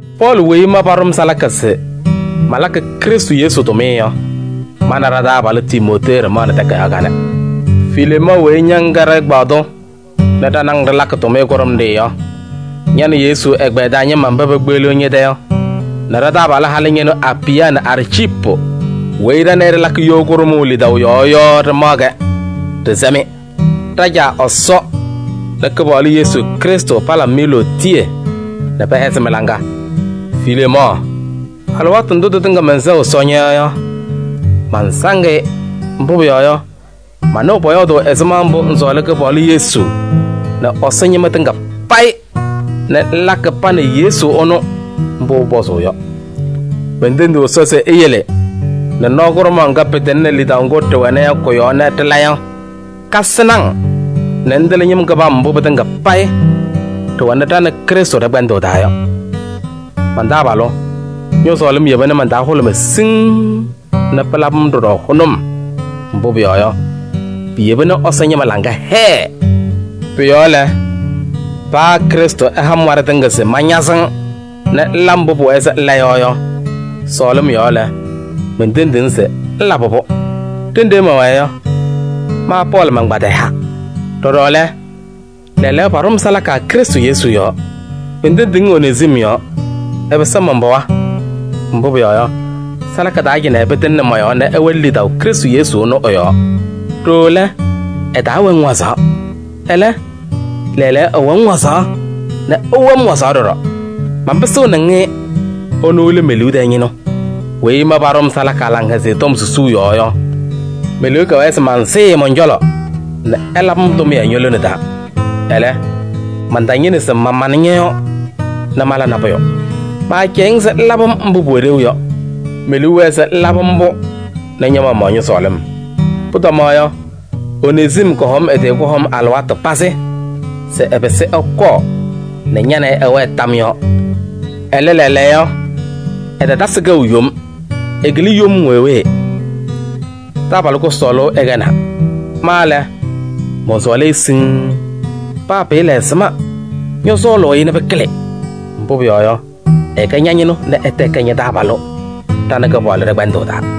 Pɔɔlɩ weyi ma paɖʋ-m salaka se malakɩ Krɩstʋ Yesu tʋmɩyɛ yɔ, ma nɛ ɖa-taabalʋ Timootee ɖɩmaɣnɩ takayaɣ kanɛ. Fileemɔɔ weyi ña ŋkɛ ɖɛ-ɛgbaadʋ nɛ ɖa nɛ ŋ ɖɩlakɩ tʋmɩyɛ kʋɖʋmɖɩyɛ yɔ, ña nɛ Yesu ɛgbɛyɛ taa ñɩma mba pekpeɣliɣ ñɛ-tɛ yɔ nɛ ɖa-taabalʋ halʋ ñɩnʋ Apɩya nɛ Arciipu weyi ɖa nɛ ɩ ɖɩlakɩ you kʋɖʋmʋʋ lidaʋ yɔɔ yɔ ɖɩmaɣ-kɛ, ɖɩsɛ-mɩ: ɖa-Caa Ɛsɔ nɛ Kɩpaɣlʋ Yesu Krɩstʋ palabɩ-mɩ lootiye nɛ pɛhɛzɩ mɩ-laŋa. Fileemɔɔ, alɩwaatʋ ndʋ tɩtɩŋa mɛnsɛɣ Ɛsɔ ñɔ-yɔɔ yɔ, mansaŋ-ɩ. Mbʋ pʋyɔɔ yɔ, manɩɣ pɔyɔɔdʋʋ ɛzɩma mbʋ ŋsɔɔlɩ Kɩpaɣlʋ Yesu nɛ Ɛsɔ ñɩma tɩŋa payɩ nɛ ŋlakɩ pa nɛ Yesu ɛnʋ mbʋ pʋpɔzʋʋ yɔ. Mentendiɣ Ɛsɔ se eyele nɛ nɔɔ kʋɖʋmaɣ ŋga pɩtɩŋnɩ lidaʋ ŋgʋ ɖɩwɛnɩ yɔ kʋ-yɔɔ nɛ ɖɩla yɔ, kasɩnɩ-ŋ nɛ ŋtɩlɩ ñɩm kɩbam mbʋ pɩtɩŋa payɩ ɖɩwɛnɩ ɖa nɛ Krɩstʋ ɖɛ-kpɛndʋʋ taa yɔ. Man-taabalʋ, ñɔ-sɔɔlɩm yeba nɛ man-taa hʋlʋmɩ siŋŋ nɛ pɩlabɩ-m ɖɔɖɔ hʋnʋm. Mbʋ pʋyɔɔ yɔ, piyeba nɛ Ɛsɔ ñɩma laŋa hɛɛ. Pʋ-yɔɔ lɛ, paa Krɩstʋ ɛha-m waɖɛ tɩŋa se mañazɩ-ŋ nɛ ŋla mbʋ pʋwɛɛ se ŋla yɔ yɔ, sɔɔlɩm yɔɔ lɛ, mentendiɣ-ŋ se ŋlabɩ-pʋ. Ɖenɖe mɛwɛɛ yɔ, ma Pɔɔlɩ mankpadɩyaa. Ɖɔɖɔ lɛ, lɛɛlɛɛyɔ paɖʋ-m salaka Krɩstʋ Yesu yɔɔ. Mentendiɣ-ŋ Onezim yɔɔ. Ɛpɩsɩ man-pɩɣa, mbʋ pʋyɔɔ yɔ, salaka taa cɩnɛ pɩtɩŋnɩ mɔ-yɔɔ nɛ ɛwɛnɩ lidaʋ Krɩstʋ Yesu ɛnʋ ɛ-yɔɔ. Ɖooo lɛ, ɛtaawɛ-ŋ wazaɣ. Ɛlɛ, lɛɛlɛɛyɔ ɛwɛ-ŋ wazaɣ nɛ ɛwɛ-m wazaɣ ɖɔɖɔ. Manpɩsɩɣnɩ-ŋ-ɩ, ɛnʋ lɛ me-liu tɛɛ ñɩnʋ. Weyi ma paɖʋ-m salaka Laŋhɛzɩyɛ Tɔm susuu yɔɔ yɔ, me-liu kɛwɛɛ se mansɩɩ-ɩ mɔn-cɔlɔ nɛ ɛlabɩ-m tʋmɩyɛ ño-lone taa. Ɛlɛ, mantañɩnɩ se mamanɩ ñɔ-yɔɔ nɛ mala nabʋyʋ: maacɛyɩɣ-ŋ se ŋlabɩ-m mbʋ pʋwɛ ɖeu yɔ. Me-liu wɛɛ se ŋlabɩ-m-pʋ nɛ ña-maɣmaɣ ñɔ-sɔɔlɩm. Pʋtɔma yɔ, Onezim kɔhɔm ɛ-tɩ kʋhɔm alɩwaatʋ pazɩ se ɛpɩsɩ ɛkɔɔ nɛ ña nɛ ɩ ɩwɛɛ tam yɔɔ. Ɛlɛ lɛɛlɛɛyɔ, ɛtatasɩ kɛʋ yom. Ɛkɩlɩ yom wee wee. Taabalʋ kʋsɔɔlʋ ɛkɛnaa. Ma lɛ, mɔnsɔɔlɩ-ɩ siŋŋ. Paa pɩɩla ɛzɩma, ñɔsɔɔlʋʋ-ɩ nɛ pɩkɩlɩ. Mbʋ pʋyɔɔ yɔ, ɛkɛ ña-ñɩnʋ nɛ ɛtɛ ɛkɛ ña-taabalʋ ɖa nɛ Kɩpaɣlʋ ɖɛ-kpɛndʋʋ taa.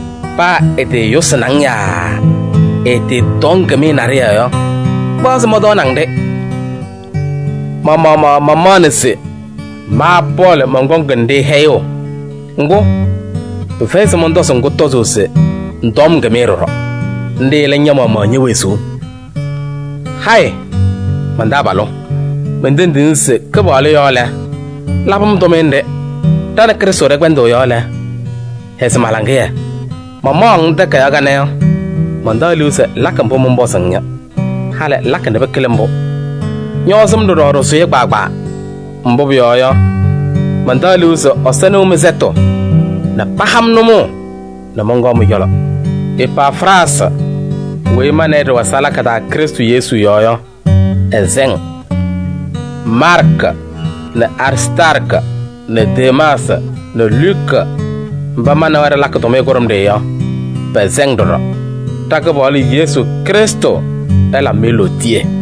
Paa ɛtɩɩyʋsɩnɩ-ŋ yaa ɛtɩɩtɔɔ-ŋ kɩmɩyɛ naɖɩyɛ yɔ, kpaɣ se mɔntɔɔnɩ-ŋ-ɖɩ. Ma-maɣmaɣ mamaɣnɩ se: ma Pɔɔlɩ mɔnkɔŋ-ŋ-ɖɩ hɛyʋʋ. Ŋgʋ, pɩfɛyɩ se mɔntɔzɩ-ŋ kʋtɔzʋʋ se ŋtɔɔ-m kɩmɩyɛ ɖɔɖɔ. Nɖɩ lɛ ña-maɣmaɣ ñe-wezuu. Hayɩ! Man-taabalʋ, mentendiɣ-ŋ se Kɩpaɣlʋ yɔɔ lɛ, labɩ-m tʋmɩyɛ nɖɩ. Ɖa nɛ Krɩstʋ ɖɛ-kpɛndʋʋ yɔɔ lɛ, hɛzɩ ma-laŋɩyɛ. Mamaɣʋ-ŋ takayaɣ kanɛ yɔ, mantaɣ liu se ŋlakɩ mbʋ mɔnpɔzɩ-ŋ yɔ. Halɩ ŋlakɩ nɛ pɩkɩlɩ mbʋ. Ñɔɔzɩ-m ɖɔɖɔ ɖɩsʋyɛ kpaagbaa. Mbʋ pʋyɔɔ yɔ, mantaɣ liu se Ɛsɔ nɩɣ mɩ-sɛtʋ nɛ paha-m nʋmɔʋ nɛ mɔnkɔɔ mɩ-cɔlɔ. Epafraasɩ weyi ma nɛ ɩ ɖɩwɛ salaka taa Krɩstʋ Yesu yɔɔ yɔ, ɛsɛ-ŋ. Maarkɩ nɛ Aristaarkɩ nɛ Demaasɩ nɛ Luka mba ma nɛ wɛ ɖɩlakɩ tʋmɩyɛ kʋɖʋmɖɩyɛ yɔ, pɛsɛ-ŋ ɖɔɖɔ. Ɖa-Kɩpaɣlʋ Yesu Krɩstʋ ɛlabɩ-mɩ lootiye.